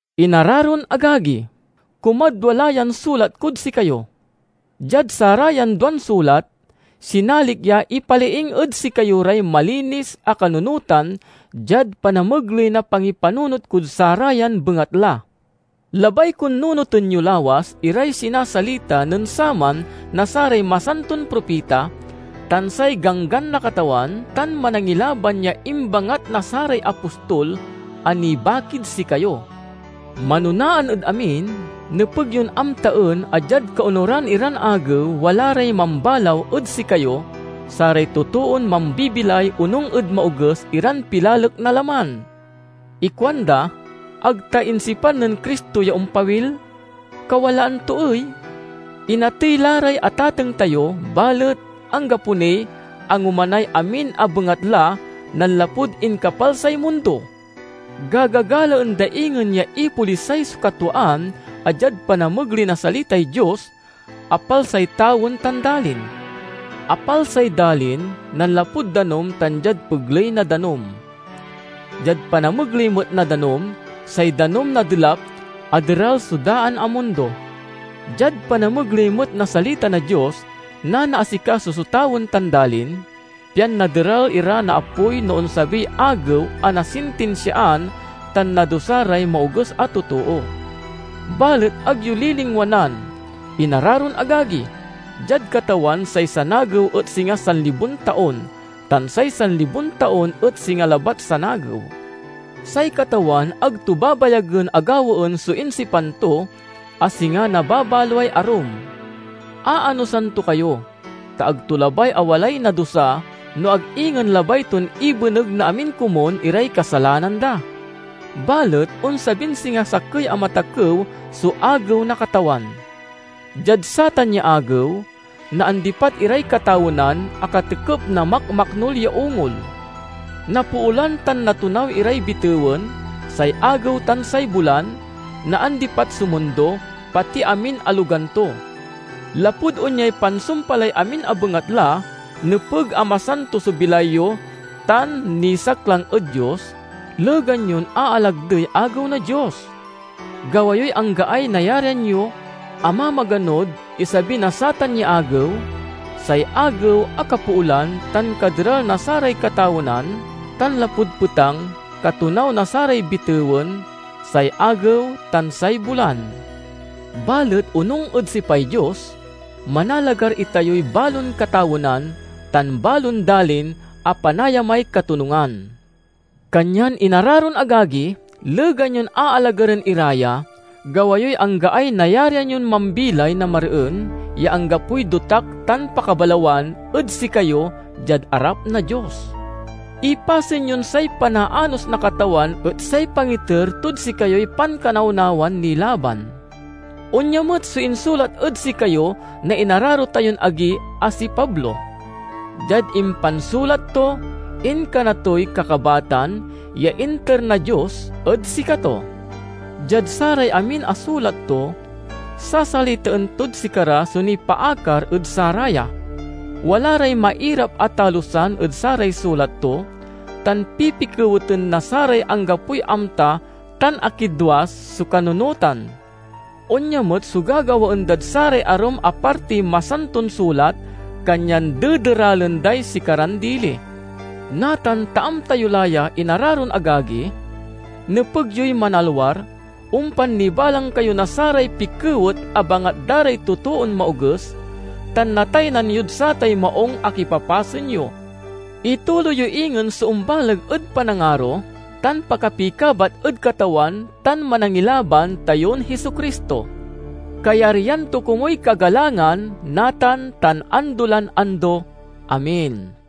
Inararon agagi! Kumadwa la yan sulat kod sikayo. Diad sarayan duan sulat, sinalik ya ipaliing ed sikayo ray malinis a kanunotan diad panamegley na pangipanunot kod sarayan bengatla. Labay kon nunoten yo lawas iray sinasalita nen saman na saray masanton propita, tan say ganggan na Katawan tan Manangilaban ya imbangat na saray apostol a nibakid sikayo. Manonaan ed amin, nepeg yon amtaen a diad kaonuran iran agew wala ray mambalaw ed sikayo, saray totoon mambibilay onung ed maoges iran pilalek na laman. Ikuanda, "Ag ta insipan nen Cristo ya ompawil? Kawalaan to ey? Inatey la ray atateng tayo, balet anggapo niy angomanay amin a bengatla nanlapud inkapalsay mundo!" Gagagalaen da ingen ya ipolisay so katwaan a diad panamegley na salitay Dios, apalsay tawen tan dalin. Apalsay dalin nanlapud danum tan diad pegley na danum. Diad panamegley met na danum, say danum na Delap, aderal so daan a mundo. Diad panamegley met na salita na Dios nanaasikaso so tawen tan dalin, pian naderal ira na apoy no onsabiy agew a nasintinsiaan tan nadusa ray maoges a totoo. Balet ag yo ya lilingwanan, inararon agagi: diad Katawan say sanagew et singa sanlibon taon tan say sanlibon taon et singa labat sanagew. Say Katawan ag to babayagen a gawaen so insipan to, a singa nababaloay arum. Aanosan to kayo, ta ag to labay a walay nadusa, no ag ingen labay ton ibeneg na amin komun iray kasalanan da. Balet onsabin singa sakey a matakew so Agew na Katawan. Diad satan ya Agew, naandipat iray katawenan a katekep na makmaknul ya ungol. Napoolan tan natonaw iray bitewen, say agew, tan say bulan; naandipat so mundo, pati amin a logan to. Lapud onyay pansumpalay amin a bengatla, nepeg a masanto so bilay yo tan nisaklang ed Dios, legan yon aalagdey Agew na Dios. Gawa yoy anggaay nayarian yo a mamaganod isabi na satan ya Agew, say Agew a kapoolan tan kaderal na saray katawenan tan, lapud petang, katonaw na saray bitewen, say agew, tan say bulan. Balet onung ed sipay Dios, manalagar itayoy balon katawenan tan balon dalin a panayamay katonungan. Kanyan inararon agagi, legan yon aalagaren ira ya, gawa yoy anggaay nayarian yon mambilay na mareen, ya anggapoy dotak tan pakabalawan ed sikayo diad arap na Dios. Ipasen yon say panaanos na Katawan et say pangiter tod sikayoy pankanawnawan nilaban. Onya met so insulat ed sikayo na inararo tayon agi a si Pablo. Diad impansulat to, inkana toy kakabatan ya inter na Dios ed sikato. Diad saray amin a sulat to, sasalitaen tod sikara so nipaakar ed saraya. Wala ray mairap a talusan ed saray sulat to, tan pipikeweten na saray anggapoy amta tan akidwas so kanunotan. Onya met so gagawaen dad saray arum a partiy Masanton Sulat, kanyan dederalen day sikaran dili. Natan ta amta yo la ya, inararon agagi, nepeg yoy manalwar, ompan nibalang kayo na saray pikewet a bangat da ray totoon maoges, tan nataynan yod satay maung a kipapasen yo. Ituloy yo ingen so ombaleg ed panangaro tan pakapikabat ed Katawan tan Manangilaban tayon Jesu-Cristo. Kayaryan to komuy kagalangan, natan tan ando lan ando! Amen.